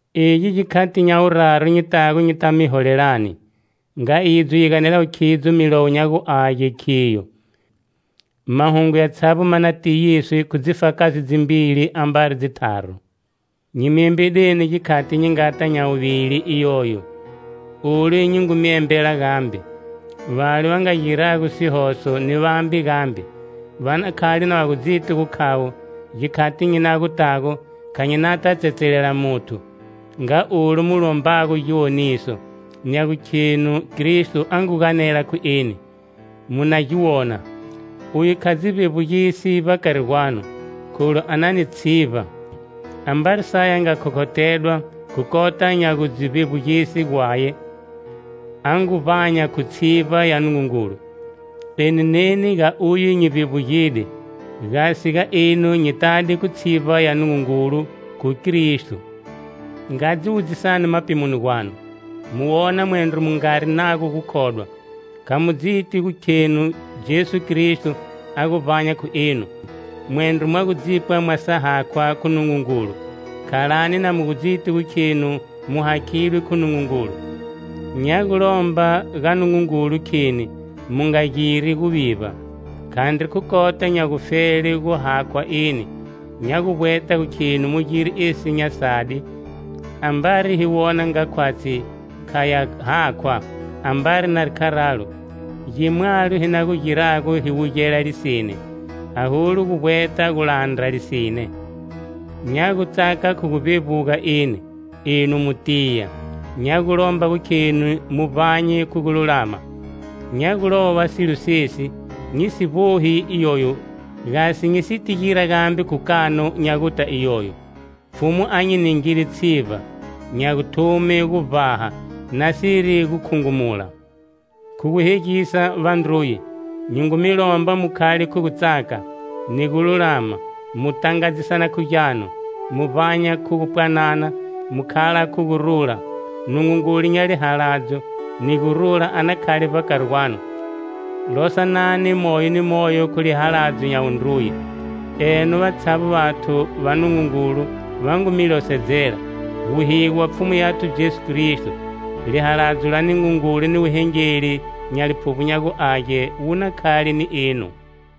Egi gikhati nya wuraru nyi tago nyita mi holelani. Nga idzo yi ganelago khidzo Milowo nya gu Age, khiyo: mahungu yatshavbo ma na tiyiswe khu dzifakazi dzimbili ambari dzitharu. Nyi mi embedeni gikhati nyi ngata nya guvili iyoyo, olu nyi ngu mi embela gambe. Vale va nga gira sihoso, ni vambe gambe, va na khale na va gudziti gukhavo, gikhati nyi na gu tago, kha nyi nata tsetselela muthu. Nga olu mu lombago giwoniso, nya gukhenu Kristo a ngu ganela khu eni, mu na gi wona. Uye kha dzi vbevbugisi vbakari gwanu, kholu a na ni tshivba. Ambari saye a nga khokhothedwa khu kota nya gu dzi vbevbugise Gwaye, a ngu vbanya khu tshivba ya Nungungulu. Eni neni ga Uye nyi vbevbugide. Gasi ga enu nyi tade khu tshivba ya Nungungulu, khu Kristo. Nga dzi wudzisani mapimoni gwanu, mu wona mwendro mu ngari nago gukhodwa. Kha mu dziti gu khenu Jesu Kristo, a gu vbanya khu enu? Mwendro mwa gu dzipwa mwa sa hakhwa khu Nungungulu! Khalani na mu gu dziti gu khenu mu hakhidwe khu Nungungulu. Nya gu lomba ga Nungungulu, kheni mu nga giri guvivba. Khandri khu kota nya gufele gu hakhwa eni, nya gu vbweta gu kheni mu gire esi nya sadi, ambari hi wona nga khwatshi kha ya hakhwa. Ambari nari kharalo, gimwalo hi na gu girago hi wugela lisine, aholu gu vbweta gu landra lisine. Nya gutsaka khu gu vbevbuga eni, enu mu tiya. Nya gu lomba gukheni mu vbanye khu gululama. Nya gu lova silo sesi, nyi si gu vbohi iyoyo, gasi nyi siti gira gambe khu kanu nya guta iyoyo. Pfhumu a nyi ningide tshivba, nya guthume gu vbaha, nasiri gu khungumula. Khu guhegisa, vandruye, nyi ngu mi lomba mu khale khu gutsaka, ni gululama, mu tangadzisana khu gyanu. Mu vbanya khu gu pwanana, mu khala khu gurula, Nungungulu nya lihaladzo, ni gurula a na khale vbakari gwanu. Losanani moyo ni moyo khu lihaladzo nya wundruye. Eno, vatshavbo vathu va Nungungulu va ngu mi losedzela. Wuhigo wa Pfhumu yathu Jesu Kristo, lihaladzo la Nungungulu ni wuhengeli nya Liphuvbo nya gu Age, wu na khale ni enu.